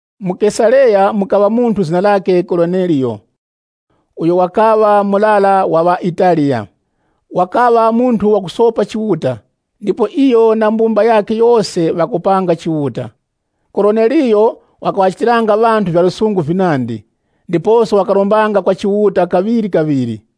Mu Kesareya, mukaŵa munthu zina lakhe Koroneliyo, uyo wakaŵa murara wa ŵaItaliya. Wakaŵa munthu wakusopa Chiuta, ndipo iyo na mbumba yakhe yose ŵakopanga Chiuta. Koroneliyo wakaŵachitiranga ŵanthu vya lusungu vinandi, ndiposo wakarombanga kwa Chiuta kaŵirikaŵiri.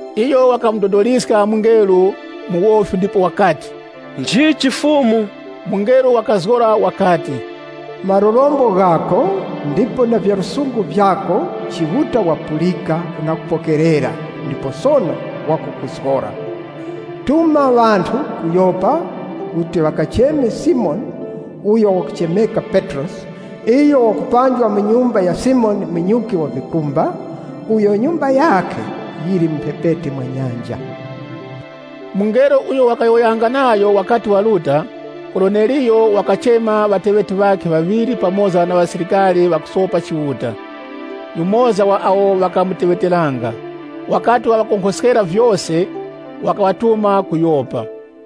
Iyo wakamudodoliska mungelo mu wofi ndipo wakati, “Nchichi, Fumu?” Mungelo wakazgora wakati, “Malurombo ghako, ndipo na vya lusungu vyako Chiuta wapulika na kupokerera ndipo sono wakukuzgora. Tuma ŵanthu ku Yopa kuti ŵakacheme Simoni uyo wakuchemeka Petrosi Iyo wakupanjwa mu nyumba ya Simoni munyuki wa vikumba, uyo nyumba yakhe yili mu mphepete mwa nyanja.” Mungelo uyo wakayowoyanga nayo wakati waruta, Koroneliyo wakachema ŵateŵeti ŵakhe ŵaŵiri pamoza na musilikari wakusopa Chiuta, yumoza wa awo ŵakamuteŵeteranga. Wakati waŵakonkhoskera vyose, wakaŵatuma ku Yopa.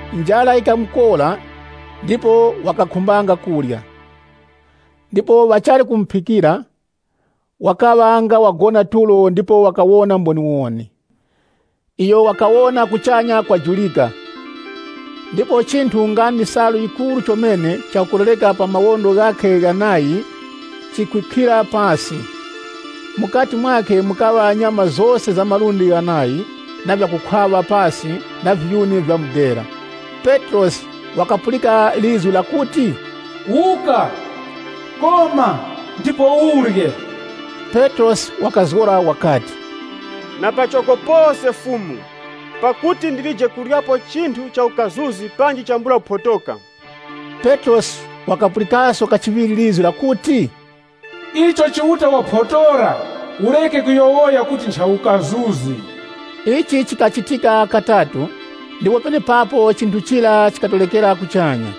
Njara yikamukora ndipo wakakhumbanga kurya. Ndipo ŵachali kumuphikira, wakaŵa nga wagona tulo ndipo wakawona mboniwoni. Iyo wakawona kuchanya kwajurika, ndipo chinthu, nga ndi salu yikuru chomene chakukolereka pa mawondo ghakhe ghanayi, chikwikhira pasi. Mukati mwakhe mukaŵa nyama zose za malundi ghanayi na vyakukhwaŵa pasi na viyuni vya mudera. Petrosi wakapulika lizgu lakuti, “Wuka, koma, ndipo urye!” Petrosi wakazgora wakati, “Na pachoko pose, Fumu! Pakuti ndilije kuryapo chinthu cha ukazuzi panji chambula kuphotoka.” Petrosi wakapulikaso kachiŵiri lizgu lakuti, “Icho Chiuta waphotora ureke kuyowoya kuti ncha ukazuzi.” Ichi chikachitika katatu ndipo penepapo chinthu chira chikatorekera kuchanya.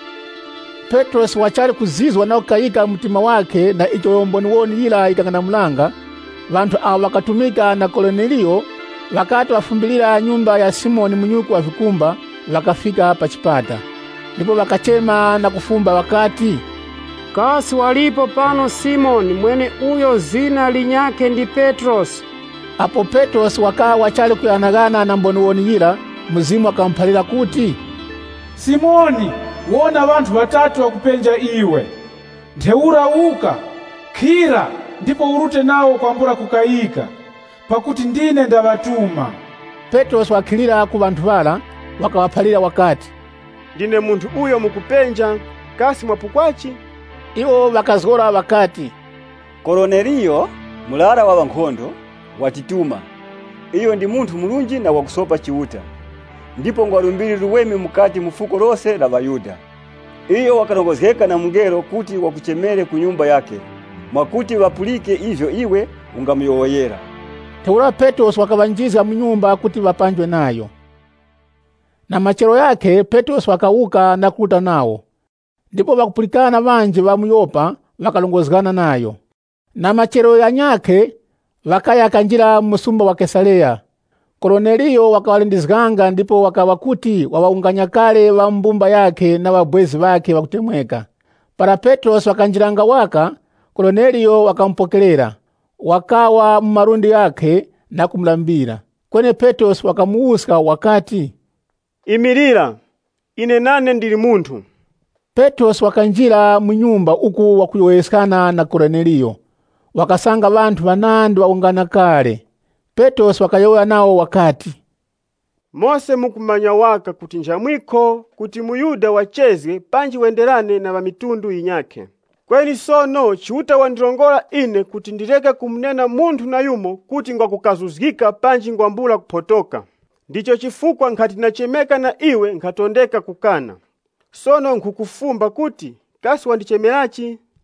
Petrosi wachali kuzizwa na kukayika mu mtima wakhe na icho mboniwoni yira yikang'anamulanga, ŵanthu awo ŵakatumika na Koroneliyo, wakati wafumbilira nyumba ya Simoni munyuki wa vikumba, ŵakafika pa chipata, ndipo ŵakachema na kufumba ŵakati, “Kasi walipo pano Simoni mweneuyo zina lakhe linyakhe ndi Petrosi?” Apo Petrosi wakaŵa wachali kughanaghana na mboniwoni yira, Mzimu wakamuphalira kuti, “Simoni, wona ŵanthu ŵatatu ŵakupenja iwe. Ntheura wuka, khira, ndipo urute nawo kwambula kukayika, pakuti ndine ndaŵatuma.” Petrosi wakakhilira ku ŵanthu ŵara, wakaŵaphalira wakati, “Ndine munthu uyo mukupenja. Kasi mwapukwachi?” Iwo ŵakazgora ŵakati, “Koroneliyo, murara wa ŵankhondo, watituma. Iyo ndi munthu murunji na wakusopa Chiuta, ndipo ngwa lumbiri luweme mukati mu fuko lose la ŵaYuda. Iyo wakarongozgeka na mungelo kuti wakuchemere ku nyumba yakhe, mwakuti wakapulike ivyo iwe ungamuyowoyera.” Ntheura Petrosi wakaŵanjizga mu nyumba kuti ŵapanjwe nayo. Petrosi wakuruta ku nyumba ya Koroneliyo Na machero ghakhe, Petrosi wakawuka na kuruta nawo, ndipo ŵakupulikana ŵanji ŵa mu Yopa ŵakarongozgana nayo. Na machero ghanyakhe, ŵakaya kanjira mu msumba wa Kesareya. Koroneliyo wakaŵalindizganga ndipo wakaŵa kuti wawunganya kale ŵa mu mbumba yakhe na ŵabwezi ŵakhe ŵakutemweka. Para Petrosi wakanjiranga waka, Koroneliyo wakamupokerera, wakawa mu malundi ghakhe, na kumulambira. Kweni Petrosi wakamuwuska wakati, “Imilira. Ine nane ndili munthu.” Petrosi wakanjira mu nyumba uku wakuyowoyeskana na Koroneliyo, wakasanga ŵanthu ŵanandi ŵawungana kale. Petrosi wakayowoya nawo wakati, “Mose mukumanya waka kuti nchamwikho kuti muYuda wachezge panji wenderane na ŵanthu ŵa mitundu yinyakhe. Kweni sono Chiuta wandirongora ine kuti ndireke kumunena munthu nayumo kuti ngwa kukazuzgika panji ngwambula kuphotoka. Ndicho chifukwa nkhati ndachemeka na iwe nkhatondeka kukana. Sono nkhukufumba kuti, kasi wandichemerachi?”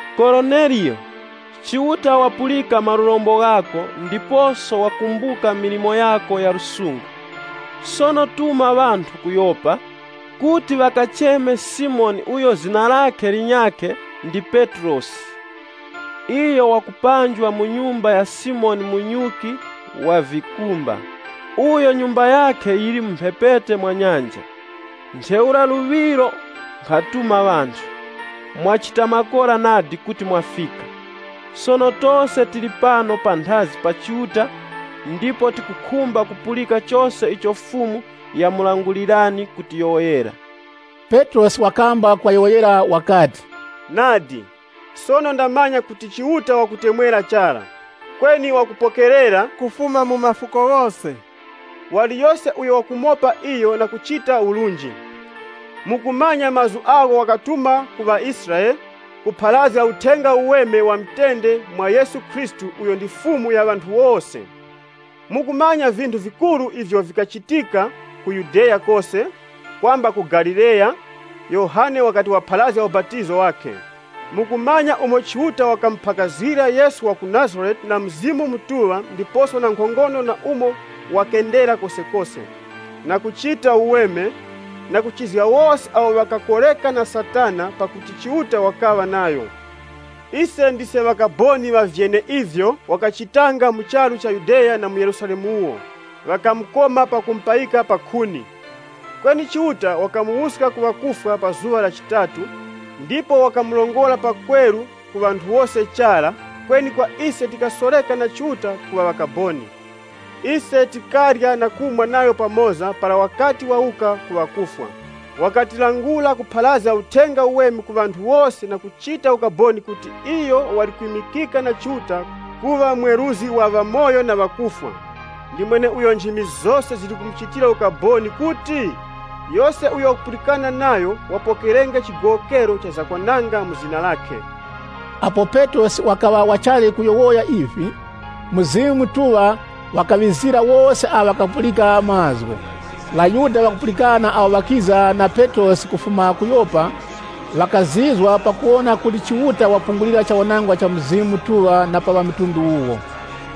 ‘Koroneliyo, Chiuta wapulika malurombo ghako ndiposo wakumbuka milimo yako ya lusungu. Sono tuma ŵanthu ku Yopa, kuti ŵakacheme Simoni uyo zina lakhe linyakhe ndi Petrosi. Iyo wakupanjwa mu nyumba ya Simoni munyuki wa vikumba, uyo nyumba yakhe yili mu mphepete mwa nyanja.’ Ntheura luŵiro nkhatuma ŵanthu. Mwachita makora nadi kuti mwafika. Sono tose tili pano panthazi pa Chiuta ndipo tikukhumba kupulika chose icho Fumu yamulangulani kutiyowoyera.” Petrosi wakamba kuŵayowoyera wakati, “Nadi, sono ndamanya kuti Chiuta wakutemwera chara. Kweni wakupokerera, kufuma mu mafuko ghose, waliyose uyo wakumopa iyo na kuchita urunji. Mukumanya mazgu agho wakatuma ku ŵaIsraele, kupharazga Uthenga Uweme wa mutende mwa Yesu Khristu uyo ndi Fumu ya ŵanthu wose. Mukumanya vinthu vikuru ivyo vikachitika ku Yudeya kose, kwamba ku Galileya, Yohane wakati wapharazga ubapatizo wakhe. Mukumanya umo Chiuta wakamuphakazgira Yesu wa ku Nazarete na Mzimu Mutuŵa ndiposo na nkhongono na umo ŵakendera kosekose, na kuchita uweme, na kuchizga wose awo ŵakakoreka na Satana, pakuti Chiuta wakaŵa nayo. Ise ndise ŵakaboni ŵa vyeneivyo wakachitanga mu charu cha Yudeya na mu Yerusalemu wuwo. Ŵakamukoma pakumupayika pa mphinjika. Kweni Chiuta wakamuwuska ku ŵakufwa pa zuŵa la chitatu, ndipo wakamurongora pakweru, ku ŵanthu wose chara, kweni kwa ise tikasoreka na Chiuta kuŵa ŵakaboni. Ise tikarya na kumwa nayo pamoza para wakati wawuka ku ŵakufwa. Wakatilangula kupharazga Uthenga Uweme ku ŵanthu wose na kuchita ukaboni kuti iyo ndiyo wali kwimikika na Chiuta kuŵa mweruzgi wa ŵamoyo na ŵakufwa. Ndi mweneuyo nchimi zose zili kumuchitira ukaboni kuti, yose uyo wakupulikana nayo, wapokerenge chigowokero cha zakwananga mu zina lakhe.” Apo Petrosi wakaŵa wachali kuyowoya ivi, Mzimu Mutuŵa wakaŵizira wose awo ŵakapulika mazgu. ŴaYuda ŵakupulikana awo ŵakiza na Petrosi kufuma ku Yopa, ŵakazizwa pakuwona kuti Chiuta wapungulira chawanangwa cha Mzimu Mutuŵa na pa ŵamitundu wuwo.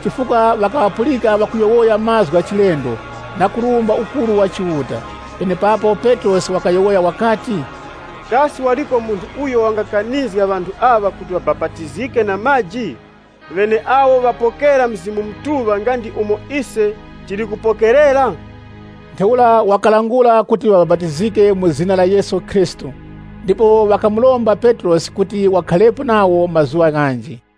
Chifukwa ŵakaŵapulika ŵakuyowoya mazgu gha chilendo na kurumba ukuru wa Chiuta. Penepapo Petrosi wakayowoya wakati, “Kasi waliko munthu uyo wangakanizga ŵanthu aŵa kuti ŵabapatizike na maji, ŵeneawo ŵapokera Mzimu Mutuŵa nga ndi umo ise tili kupokerera?” Ntheura wakalangula kuti ŵabapatizike mu zina la Yesu Khristu. Ndipo ŵakamuromba Petrosi kuti wakharepo nawo mazuŵa ghanji.